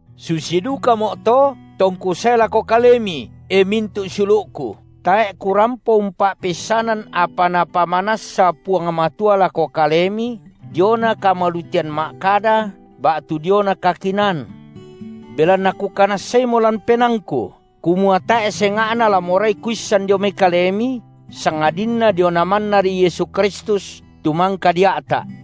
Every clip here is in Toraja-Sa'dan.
Susi dukamo’to, tongku sae lako kalemi, e mintu’ siulu’ku, tae’ kurampo umpa’peissanan apa Napamanassa Puang Matua lako kalemi diona kamalutean ma’kada ba’tu diona kakinaan. Belanna kukanassaimo lan penaangku kumua tae’ senga’na la morai kuissan dio kalemi, sangadinna diona mannari Yesu Kristus tu mangka dia’ta’.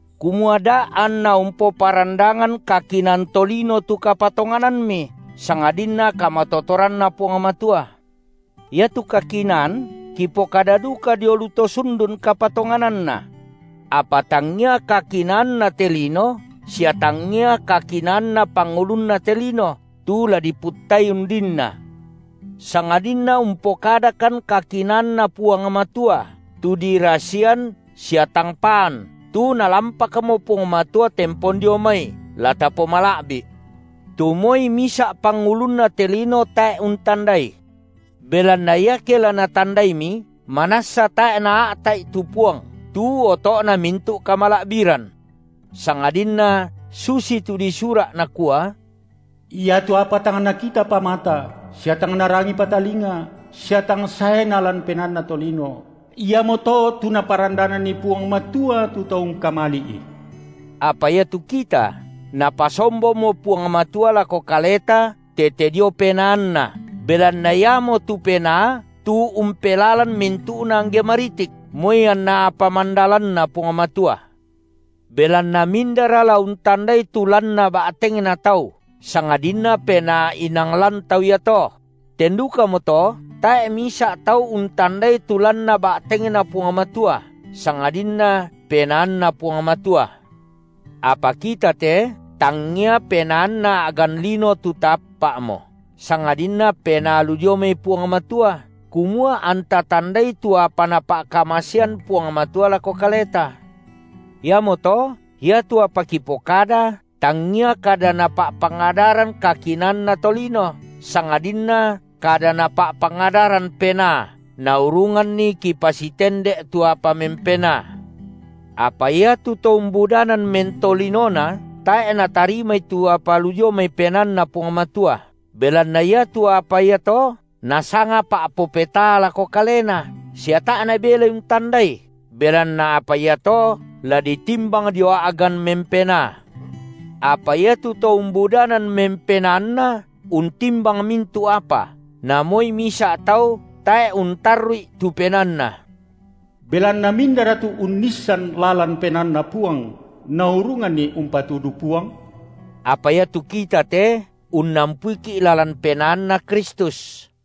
kumua da’ anna umpoparandangan kakinaan tolino tu kapatonganammi, sangadinna kamatotoranNa Puang Matua. Iatu kakinaan kipokada duka dio lu to sundun kapatongananna. Apa tangia kakinaanna te lino sia tangia kakinaanna pangulunna te lino, tu la diputtai undinna, sangadinna umpokadakan kakinaanNa Puang Matua, tu dirasian sia tang paan, tu Nalampakmo Puang Matua tempon dio mai, la tapomala’bi’, tu moi misa’ pangulunna te lino tae’ untandai. Belanna iake la natandaimi, manassa tae’ naa’ta’i tu Puang, tu oto’na mintu’ kamala’biran. Sangadinna susitu disura’, nakua: Iatu apa tang nakitapa mata, sia tang narangipa talinga, sia tang saena lan penaanna tolino, iamoto tu Naparandananni Puang Matua tu to ungkamali’I. Apa iatu kita Napasombomo Puang Matua lako kaleta tete dio PenaanNa, belanna Iamotu Penaa tu umpelalan mintu’na angge maritik, moi anna apa mandalanNa Puang Matua. Belanna mindara la untandai tu lanna ba’tengna tau, sangadinna penaa inang lan tau iato? Ten dukamoto tae’ misa’ tau untandai tu lanna ba’tengNa Puang Matua, sangadinna PenaanNa Puang Matua. Apa kita te, tangngia penaanna a’gan lino tu taappa’mo, sangadinna Penaa lu dio mai Puang Matua, kumua anta tandai tu apa Napa’kamasean Puang Matua lako kaleta. Iamoto iatu apa kipokada tangngia kada napa’pangadaran kakinaanna tolino, sangadinna kada napa’pangadaran Penaa, naurunganni kipasitende’ tu apa mempenaa. Apa iatu to umbudanan mentolinona tae’ natarimai tu apa lu dio mai PenaanNa Puang Matua, belanna iatu apa iato nasanga pa’popetaa lako kalena, sia tae’ nabelai untandai, belanna apa iato la ditimbang dio a’gan mempenaa. Apa iatu to umbudanan mempenaanna untimbang mintu’ apa, na moi misa’ tau tae’ untarru’i tu penaanna. Belanna mindara tu unnissan lalan penaanNa Puang, naurunganni umpatudu Puang? Apa iatu kita te unnampuiki’ lalan penaanNa Kristus.